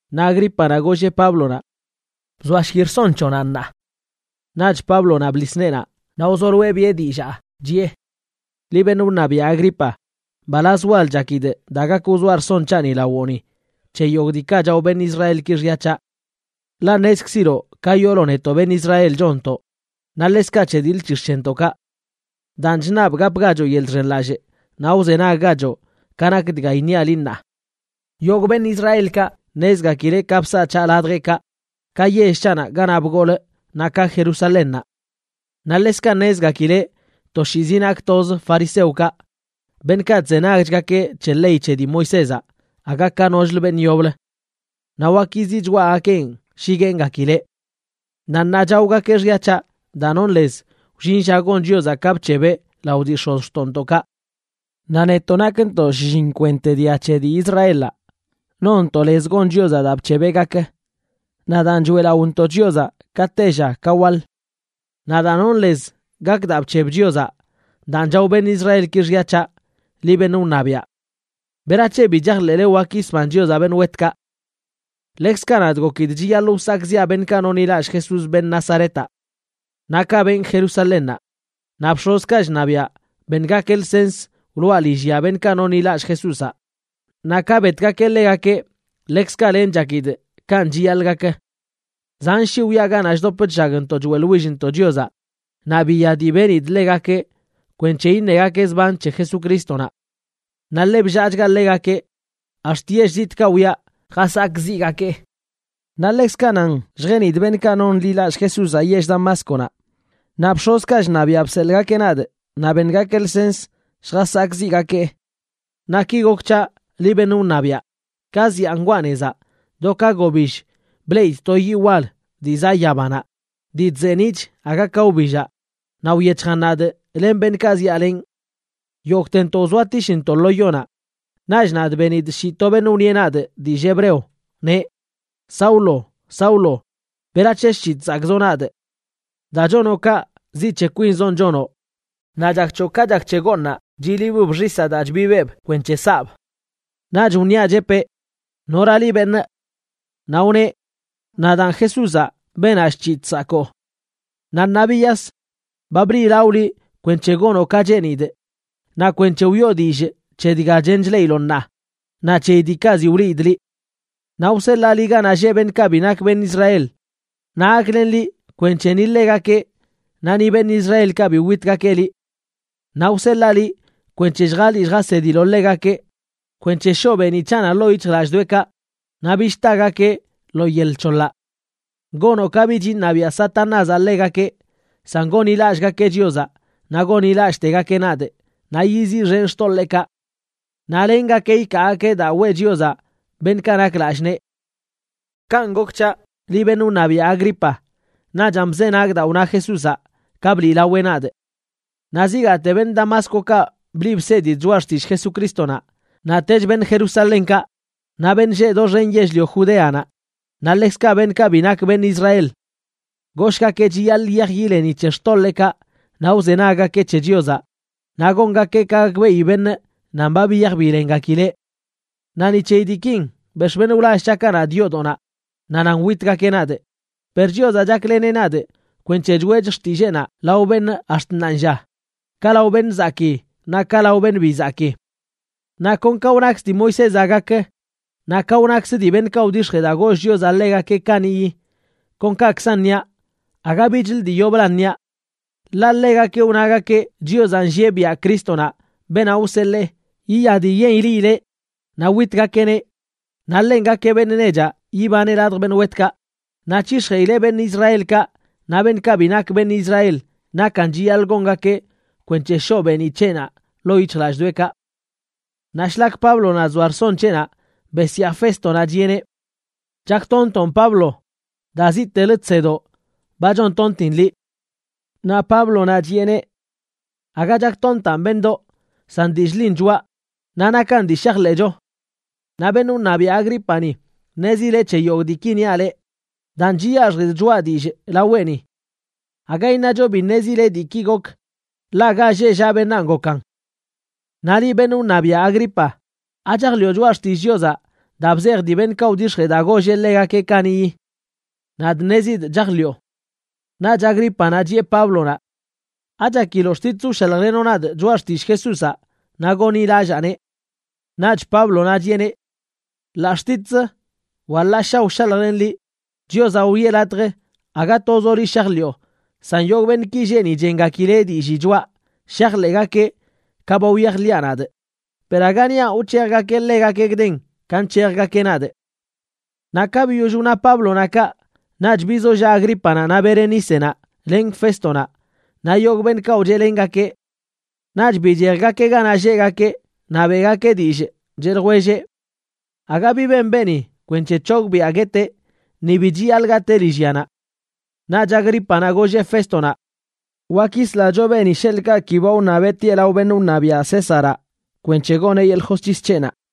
Naꞌ Agrípanaꞌ golleꞌ Páblonaꞌ: ―Bzoashki rson c̱hoꞌnaꞌ ṉaa. Naꞌch Páblonaꞌ bḻis neenaꞌ naꞌ wzoloeꞌ biꞌe dillaa, chiꞌe: ―Liꞌ beṉꞌ wṉabiaꞌ Agripa, mbalaz wal chakidꞌ daa gak wzoa rson c̱haꞌni lawoꞌni c̱he yogꞌ diikaꞌ chao beṉꞌ Israelkaꞌ xya c̱haꞌ. Ḻaꞌ ṉezkziloꞌ ka yoolo netoꞌ beṉꞌ Israel chonntoꞌ, naꞌ ḻekzkaꞌ c̱he diḻ c̱hix̱ c̱hentoꞌkaꞌ. Daan chṉabꞌ gapgachoꞌ yeḻꞌ chxenlallꞌ naꞌ wzenaggachoꞌ ka nak dga iṉiaꞌ liꞌ ṉaa. ’Yogꞌḻoḻ beṉꞌ Israelkaꞌ ṉezgakileꞌ ka bsaꞌ c̱haꞌ ladjeꞌkaꞌ, ka yell c̱haꞌnaꞌ ganaꞌ bgolꞌ naꞌ ka Jerusalénnaꞌ. Naꞌ ḻekzkaꞌ ṉezgakileꞌ toshiizi nakꞌ toz fariseokaꞌ, beṉꞌkaꞌ chzenagchgakeꞌ c̱he ley c̱he dii Moisézaꞌ aga ka nochlə beṉꞌ yoblə. Naꞌ wak yiziꞌ choꞌagakeꞌn shi gueengakileꞌ. Naꞌ ṉaa chaogakeꞌ xya c̱haꞌ daa nonꞌ lez wllin lla gon Chiozaꞌ ka bc̱hebeꞌ lao dii x̱ozxtoꞌntoꞌkaꞌ. Naꞌ netoꞌ nakntoꞌ shlliṉ kwente dia c̱he dii Israelaꞌ, nonntoꞌ lez gon Chiozaꞌ daa bc̱hebeꞌ gak, naꞌ daan choeꞌlaꞌontoꞌ Chiozaꞌ ka tella ka waḻ. Naꞌ daa nonꞌ lez gak daa bc̱heb Chiozaꞌ, daan chao beṉꞌ Israelki xya c̱haꞌ, liꞌ beṉꞌ wṉabiaꞌ. ¿Berac̱he bi chajḻeꞌle wak yisban Chiozaꞌ beṉꞌ wetkaꞌ? ’Ḻekzkaꞌ nadꞌ gokidꞌ chiyaḻꞌ wsakꞌziꞌa beṉꞌkaꞌ nonḻilallꞌ Jesús, beṉꞌ Nazaretaꞌ. Naꞌ kaꞌ benꞌ Jerusalénnaꞌ. Naꞌ bx̱ozkaꞌ chṉabiaꞌ beṉgakeꞌ lsens wloꞌa lillyanaꞌ beṉꞌkaꞌ nonḻilallꞌ Jesúzaꞌ, naꞌ ka betgakeꞌ ḻegakeꞌ ḻekzkaꞌ lenꞌ chakidꞌ kanꞌ chiyaḻꞌ gak. Zan shii wyaꞌ ganaꞌ chdop chllagntoꞌ choeꞌḻwillntoꞌ Chiozaꞌ naꞌ biya dii benidꞌ ḻegakeꞌ kwenc̱he iṉegakeꞌ zban c̱he Jesucrístonaꞌ. Naꞌ ḻe bllaachgaꞌ ḻegakeꞌ, ax̱t yell zitꞌkaꞌ wyaꞌ jasakꞌziꞌgakee. ’Naꞌ ḻekzkaꞌ nan lljenidꞌ beṉꞌkaꞌ nonḻilallꞌ Jesúzaꞌ yell Damásconaꞌ, naꞌ bx̱ozkaꞌ chṉabiaꞌ bseḻꞌgakeꞌ nadꞌ naꞌ beṉgakeꞌ lsens lljasakꞌziꞌgakee. Naꞌ ki gok c̱haꞌ, liꞌ beṉꞌ wṉabiaꞌ. Ka zyaa ngwaa nezaꞌ, do ka gobill bleꞌidꞌ to yiꞌ wal dii zaꞌ yabanaꞌ dii chzeeniꞌch aga ka wbillaꞌ, naꞌ wyec̱hjan nadꞌ len beṉꞌkaꞌ zyaalenꞌ. Yogꞌtentoꞌ wzoatishntoꞌ lo yonaꞌ, naꞌch nadꞌ benidꞌ shii to beṉꞌ wṉieꞌ nadꞌ dillꞌ hebreo, neꞌ: “Saulo, Saulo, ¿berac̱he chc̱hiꞌ chsakꞌzoꞌ nadꞌ? Daa chonoꞌ kaꞌ, ziꞌ c̱he kwinzonꞌ chonoꞌ naꞌ chak c̱hoꞌ ka chak c̱he gooṉaꞌ chilibb xisaꞌ daa chbibeꞌb kwenc̱he saꞌb.” Naꞌch wniaꞌ, chepee: “¿Nora liꞌ, beṉꞌ?” Naꞌ wneꞌ: “Nadaan Jesúzaꞌ, beenaꞌ chc̱hiꞌ chsakoo. Naꞌ ṉaa biyas. Ba bliꞌlawꞌ liꞌ kwenc̱he gonoꞌ ka cheenidꞌ naꞌ kwenc̱he wiꞌo dillꞌ c̱he dga chen chleꞌiloꞌ ṉaa naꞌ c̱heyi diikaꞌ ziꞌ wliidꞌ liꞌ. Naꞌ wseḻaa liꞌ ganaꞌ lleꞌ beṉꞌkaꞌ bi nak beṉꞌ Israel, naꞌ gaklenꞌ liꞌ kwenc̱he ni ḻegakeꞌ naꞌ ni beṉꞌ Israelkaꞌ bi witgakeꞌ liꞌ. Naꞌ wseḻaa liꞌ kwenc̱he lljaliꞌ lljasediloꞌ ḻegakeꞌ kwenc̱he shoꞌ beeniꞌ c̱haꞌnaꞌ ḻoo yic̱hjlallꞌdoꞌekaꞌ naꞌ bich tagakeꞌ lo yel c̱hoḻaꞌ. Gonoꞌ ka bich iṉabiaꞌ Satanázaꞌ ḻegakeꞌ, san gonḻilallꞌgakeꞌ Chiozaꞌ naꞌ gonḻilallꞌtegakeꞌ nadꞌ naꞌ yiziꞌxenꞌ xtoḻeekaꞌ. Naꞌ lengakeꞌ ikaagakeꞌ daa weꞌ Chiozaꞌ beṉꞌkaꞌ nak lallꞌ nee.” ’Kanꞌ gok c̱haꞌ, liꞌ beṉꞌ wṉabiaꞌ Agripa, naꞌchan bzenagꞌ daa wna Jesúzaꞌ ka bliꞌlaweꞌ nadꞌ. Naꞌ zigaate beṉꞌ Damáscokaꞌ bliꞌ bsedidꞌ choꞌa xtillꞌ Jesucrístonaꞌ, naꞌtech beṉꞌ Jerusalénkaꞌ, naꞌ beṉꞌ lleꞌ doxen yell-lio Judeanaꞌ, naꞌ ḻekzkaꞌ beṉꞌkaꞌ bi nak beṉꞌ Israel. Goshꞌgakeꞌ chiyaḻꞌ yiyaj yileni c̱he xtoḻeekaꞌ naꞌ wzenaggakeꞌ c̱he Chiozaꞌ, naꞌ gongakeꞌ ka gakbeꞌi beṉꞌ nan ba biyaj bilengakileꞌ. Naꞌ ni c̱heyi diikin, bex̱ꞌ beṉꞌ wlall c̱haꞌkaꞌ nadꞌ yoodoꞌnaꞌ naꞌ nan witgakeꞌ nadꞌ. Per Chiozaꞌ chakleneꞌ nadꞌ kwenc̱he choeꞌchꞌ xtilleenaꞌ lao beṉꞌ ax̱t ṉaanlla, ka lao beṉꞌ zakii naꞌ ka lao beṉꞌ bi zakii. Naꞌ kon ka wnakz dii Moisézaꞌ gak naꞌ ka wnakzə dii beṉꞌkaꞌ wdix̱jee daa goll Chiozaꞌ ḻegakeꞌ kaniꞌyi, kon kakzan niaꞌ, aga bichlə dii yoblan niaꞌ. Ḻaꞌ ḻegakeꞌ wnagakeꞌ Chiozaꞌ nllieꞌ biaꞌ Crístonaꞌ, beenaꞌ wseḻee, yiya dii yen ileꞌileꞌ naꞌ witgakeꞌneꞌ, naꞌ ḻenꞌ gakeꞌ beṉꞌ nechaꞌ yibaneꞌ ladj beṉꞌ wetkaꞌ, naꞌ c̱hix̱jeꞌileꞌ beṉꞌ Israelkaꞌ naꞌ beṉꞌkaꞌ bi nak beṉꞌ Israel nakan chiyaḻꞌ gongakeꞌ kwenc̱he shoꞌ beeniꞌ c̱heꞌnaꞌ ḻoo yic̱hjlallꞌdoꞌekaꞌ. Naꞌ shlak Páblonaꞌ chzoa rson c̱heꞌnaꞌ, besyaa Féstonaꞌ, chiꞌeneꞌ: ―¡Chaktontoꞌn, Pablo! Daa ziꞌtelə chsedoꞌ ba chontontin liꞌ. Naꞌ Páblonaꞌ chiꞌeneꞌ: ―Aga chaktontaꞌn, beṉꞌdoꞌ, san dillꞌ ḻin choꞌa, naꞌ nakan dii shajḻeꞌcho. Naꞌ beṉꞌ wṉabiaꞌ Agrípani ṉezileꞌ c̱he yogꞌ diiki niaꞌ leꞌ, daan chiyaxjidꞌ choꞌa dillꞌ laweꞌni. Aga iṉacho bi ṉezileꞌ diikaꞌ gok, ḻaꞌ ga lleꞌ llaꞌ beṉaan gokan. Naꞌ liꞌ, beṉꞌ wṉabiaꞌ Agripa, ¿achajḻiꞌo choꞌa xtillꞌ Chiozaꞌ daa bzej dii beṉꞌkaꞌ wdix̱jee daa golleꞌ ḻegakeꞌ kaniꞌyi? Nadꞌ ṉezidꞌ chajḻiꞌo. Naꞌch Agrípanaꞌ chiꞌe Páblonaꞌ: ―¿Achakiloꞌ xtitz wshaljlenoꞌ nadꞌ choꞌa xtillꞌ Jesúzaꞌ naꞌ gonḻilallaaneꞌ? Naꞌch Páblonaꞌ chiꞌeneꞌ: ―Ḻaꞌ xtitzə wa ḻaꞌ ssha wshaljlenꞌ liꞌ, Chiozaꞌ wiꞌe latj aga tozoꞌ liꞌ shajḻiꞌo san yogꞌ beṉꞌki lleꞌ ni chengakileꞌ dillii choꞌa shajḻeꞌgakeꞌ ka ba wyajḻiꞌa nadꞌ, per aga niaꞌ wc̱hejgakeꞌ ḻegakeꞌ gden ka nc̱hejgakeꞌ nadꞌ. Naꞌ ka biyoll wna Páblonaꞌ kaꞌ, naꞌch bizollaꞌ Agrípanaꞌ naꞌ Berenícenaꞌ len Féstonaꞌ naꞌ yogꞌ beṉꞌkaꞌ wcheꞌlengakeꞌ. Naꞌch bichejgakeꞌ ganaꞌ lleꞌgakeꞌ naꞌ beꞌgakeꞌ dillꞌ, cheꞌ ljwelleꞌ: ―Aga bi ben beeni kwenc̱he c̱hogbiꞌa gueteꞌ ni bi chiyaḻꞌ gatee lillyanaꞌ. Naꞌch Agrípanaꞌ golleꞌ Féstonaꞌ: ―Wak yislacho beeni sheḻꞌkaꞌ ki ba wṉabeꞌ tieꞌ lao beṉꞌ wṉabiaꞌ Césaraꞌ kwenc̱he goneꞌ yeḻꞌ josc̱his c̱heꞌnaꞌ.